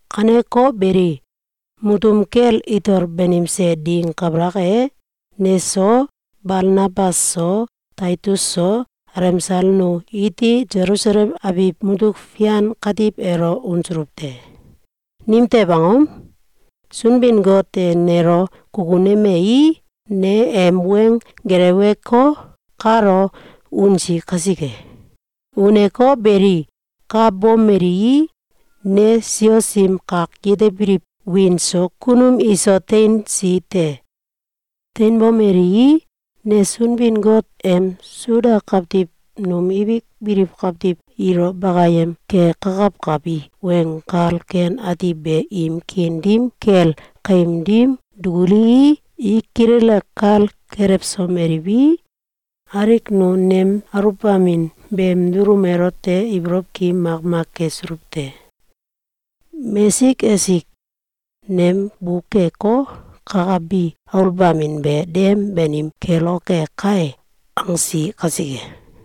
Kaneko beli, mutum kel itol banimse ding kabalak e, neso, Balnabas so, Taitus so, alemsal nu iti Selusalem abiw mutuk fian katiw elo unsuluw te. Nimtew angom? Sunbin-Got e nelo kukunemei, ne em weng geleweko, kalo unsi kasike. Uneko beli, ka bomelii, ne sios im kak yetebiliw wiin so kunum iso teinsi te. Teinbomelii, ne Sunbin-Got em Suda kawtiw num ibik biliw kawtiw ilo bakayem kekakawkabi Weng Kal Ken Ati be im kiin dim kel kaim dim dukulii, i kilele kal kelewsomeliwi, alik nu nem aluwbamin beem dulum elote ibolow ki makmak kesuluw te. Mesik esik “Nem bukeko, kakabi aluwbamin be dem banim keloke kai!”, angsi kasike.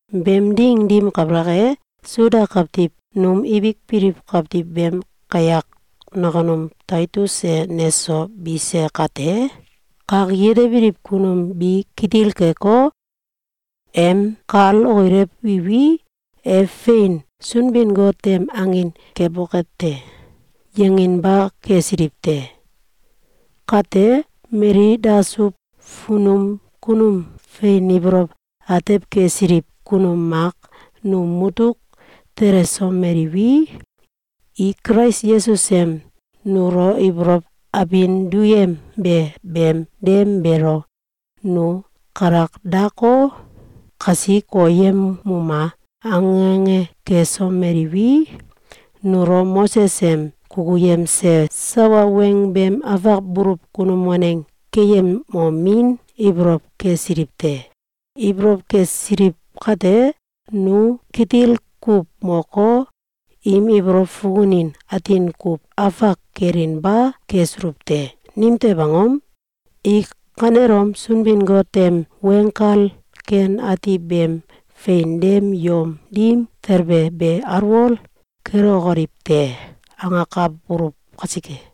Beem ding dim kabalak e, Suda kawtiw num ibik biliw kawtiw beem kayak nakunum Taitus e neso bise kate, kak yetebiliw kunum bi kitil keko, “Em kal okilewiwi, e fein Sunbin-Got em angin keboke te!”, yanginba kesiliw te. Kate, mali dasuw funum kunum fein ibolow atew kesiliw kunum mak num mutuk telesomeliwi, i Kulais Yesus em nulo ibolow abin duyembe beem dem beelo “Nu kalak dako, kasi koyemuma!”, ange ange kesomeliwi, nulo Moses em kukuyemse sawa weng beem afak buluw kunum waneng keyemomin ibolow kesiliw te. Ibolow kesiliw kate, nu kitil kuw moko, im ibolow fukunin atin kuw afak kelinba kesuluw te. Nimtew angom? “I kanelom Sunbin-Got em Weng Kal Ken Ati beem fein dem yom dim talbe be alwol kelokoliw te!”, angakabuluw kasike.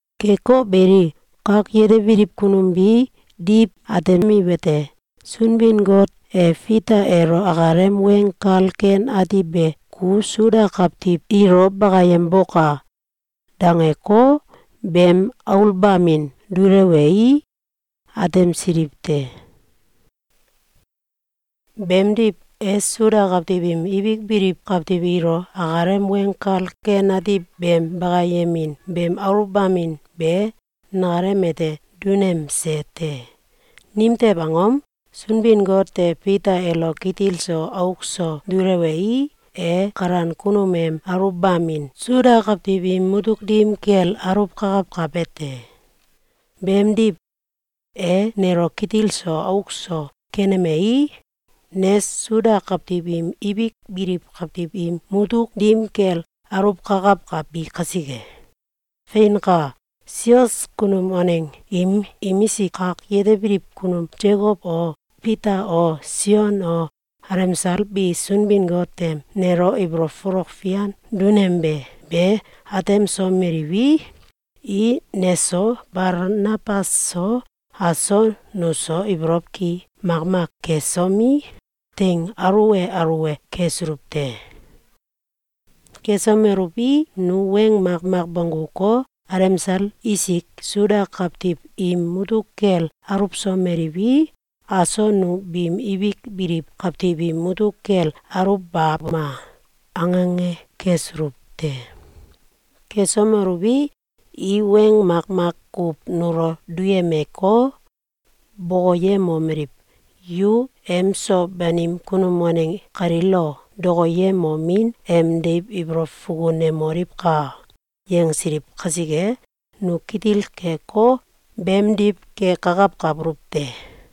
Keko beli, kak yetebiliw kunum bi diw atemiwete: Sunbin-Got e Fita elo akalem Weng Kal Ken Ati be “Ku Suda kawtiw ilo bakayemboka!”, dangeko, beem aluwbamin dulewei, atemsiliw te. Beemdiw, e Suda kawtiw im ibik biliw kawtiw ilo akalem Weng Kal Ken Ati beem bakayemin beem aluwbamin be nakalem ete dunemse te. Nimtew angom? Sunbin-Got e Fita elo kitil so auk so dulewei, e kalan kunum em aluwbamin Suda kawtiw im mutuk dim kel aluwkakawkabe te. Beemdiw, e nelo kitil so auk so kenemei, ne Suda kawtiw im ibik biliw kawtiw im mutuk dim kel aluwkakawkabi kasike. Feinka! Sios kunum waneng im imisik kak yetebiliw kunum Sekow o, Fita o, Sion o, alemsal bi Sunbin-Got em nelo ibolow folok fian dunembe be atemsomeliwi, i neso Balnabas so, aso nuso ibolow ki makmak kesomi, teing aluwe aluwe kesuluw te. Kesomeluwi, nu weng makmak bongguko, “Alemsal isik Suda kawtiw im mutuk kel aluwsomeliwi, aso nu biim ibik biliw kawtiw im mutuk kel aluwbabuma!”, ange ange kesuluw te. Kesomeluwi, i weng makmak kuw nulo duyemeko, bokoyemomeliw: “Yu emso banim kunum waneng kalilo dokoyemomin em deiw ibolow fukunemoliwka!”, yangsiliw kasike, nu kitil keko, beemdiw kekakawkabuluw te.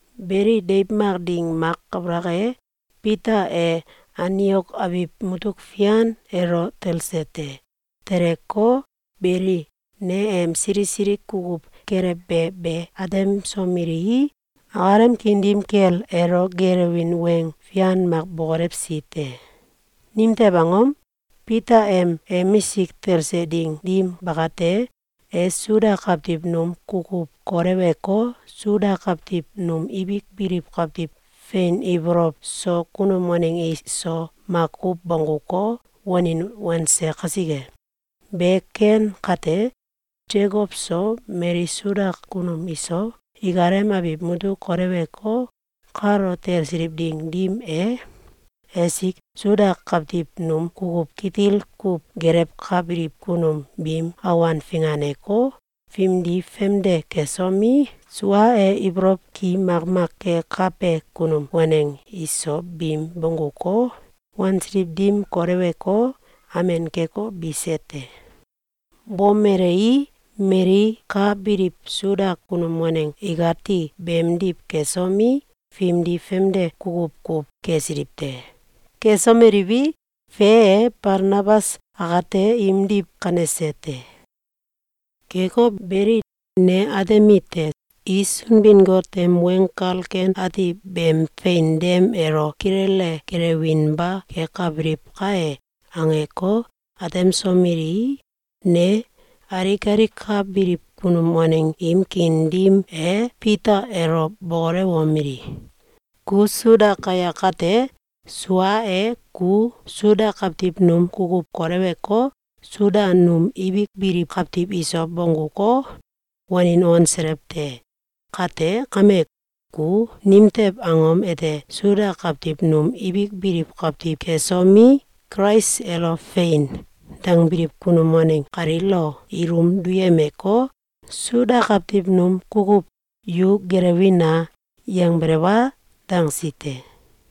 Beli, deiw mak ding mak kabalak e, Fita e Antiok abiw mutuk fian elo talse te. Teleko, belei, ne em sili sili kukuw kelewbe be atemsomelii, akalem kiin dim kel elo geelewin weng fian mak bokolewsi te. Nimtew angom? Fita em emisik talse ding dim bakate, e Suda kawtiw num kukuw koleweko, Suda kawtiw num ibik biliw kawtiw fein ibolow so kunum waneng iso makuw bongguko, wanin wanse kasike. Be ken kate, Sekow so, mali Suda kunum iso, ikalem abiw mutuk koleweko, kalo talsiliw ding dim e, esik Suda kawtiw num kukuw kitil kuw gelewkabiliw kunum biim awan finganeko, fimdi famde kesomi, sua e ibolow ki makmak kekabe kunum waneng iso biim bongguko, wansiliw dim koleweko, amen keko, bise te. Bomelei, mali ka biliw Suda kunum waneng ikati beemdiw kesomi, fimdi famde kukuw kuw kesiliw te. Kesomeliwi, fe e, Balnabas akate imdiw kanese te. Keko beli, ne atemite: “I Sunbin-Got em Weng Kal Ken Ati beem fein dem elo kilele gelewinba kekabiliw kai!”, angeko, atemsomelii, ne alik alik ka biliw kunum waneng im kiin dim e Fita elo bokolewomeli: “Ku Suda kayak kate, sua e, ku Suda kawtiw num kukuw koleweko, Suda num ibik biliw kawtiw iso bongguko, wanin wanselew te. Kate kame, ku nimtew angom ete Suda kawtiw num ibik biliw kawtiw kesomi, Kulais elo ‘Fein!’, dangbiliw kunum waneng kaliilo ilum duyemeko, Suda kawtiw num kukuw ‘Yu gelewina!’, yangbelew a?”, dangsi te.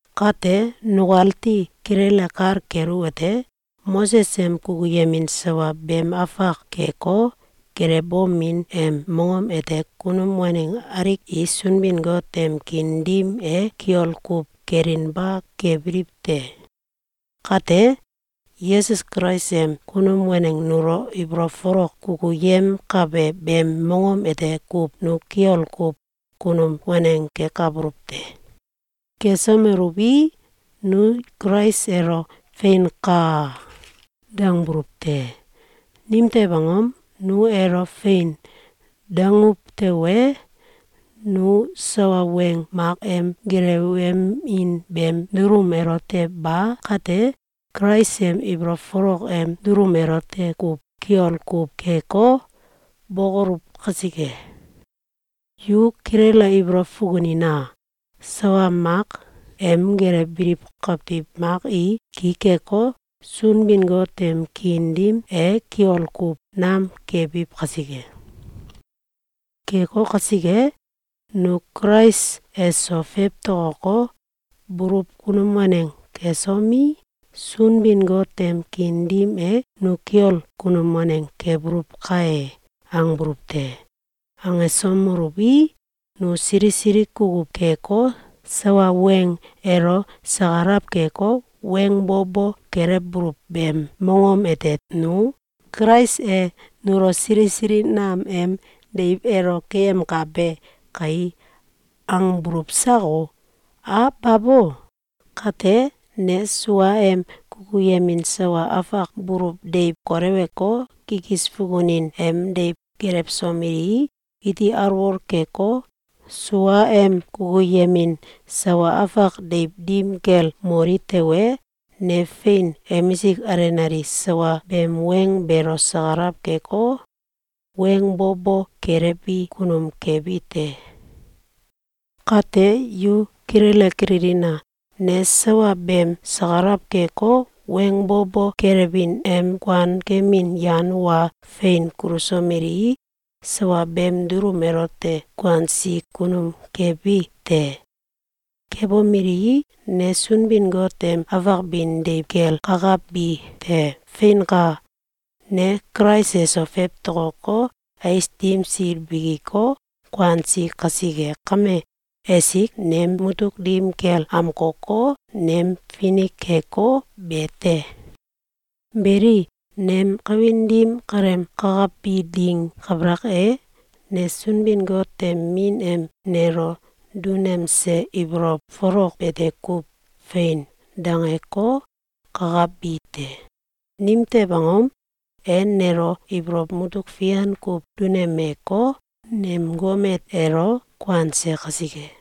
Kate nukati kilele kal keluwete: Moses em kukuyemin sawa beem afak keko, gelewbomin em mongom ete kunum waneng alik i Sunbin-Got em kiin dim e kiol kuw kelinba kebiliw te. Kate, Yesus Kulais em kunum waneng nulo ibolow folok kukuyemkabe beem mongom ete kuw nu kiol kuw kunum waneng kekabuluw te. Kesomeluwi, nu Kulais elo “Feinka!”, dangbuluw te. Nimtew angom? Nu elo “Fein!”, danguw tewe, nu sawa weng mak em gelewemin beem dulum elote ba kate, Kulais em ibolow folok em dulum elote kuw kiol kuw keko, bokoluw kasike. Yu kilele ibolow fukunina! Sawa mak em gelewbiliw kawtiw mak i ki keko, Sunbin-Got em kiin dim e kiol kuw nam kebiw kasike. Keko kasike, nu Kulais eso fewtokoko, buluw kunum waneng kesomi, “Sunbin-Got em kiin dim e nu kiol kunum waneng kebuluw kai!”, angbuluw te. Angesomeluwi, nu sili sili kukuw keko, sawa weng elo sakalaw keko, weng bo bo kelewbuluw beem mongom ete nu “Kulais e nulo sili sili nam em deiw elo keyemkabe kai!”, angbuluw sako? A babo! Kate, ne suaem kukuyemin sawa afak buluw deiw koleweko, kikis fukunin em deiw gelewsomelii, iti alwol keko, suaem kukuyemin sawa afak deiw dim kel moli tewe, ne fein emisik alenale sawa beem weng beelo sakalaw keko, weng bo bo kelewbi kunum kebi te. Kate yu kilele kililina! Ne sawa beem sakalaw keko, weng bo bo kelewbin em kuan kemin yan wa fein kulusomelii, sawa beem dulum elote kuansi kunum kebi te. Kebomelii, ne Sunbin-Got em afak bin deiw kel kakabi te. Feinka! Ne Kulais eso fewtokoko, ais dim sil bikiko, kuansi kasike kame, esik nem mutuk dim kel amkoko, nem finik keko, be te. Beli, nem kawin dim kaleem kakabi ding kabalak e, ne Sunbin-Got em Min em nelo dunemse ibolow folok bete kuw “Fein!”, dangeko, kakabi te. Nimtew angom? E nelo ibolow mutuk fian kuw dunemeko, nem gomet elo kuanse kasike.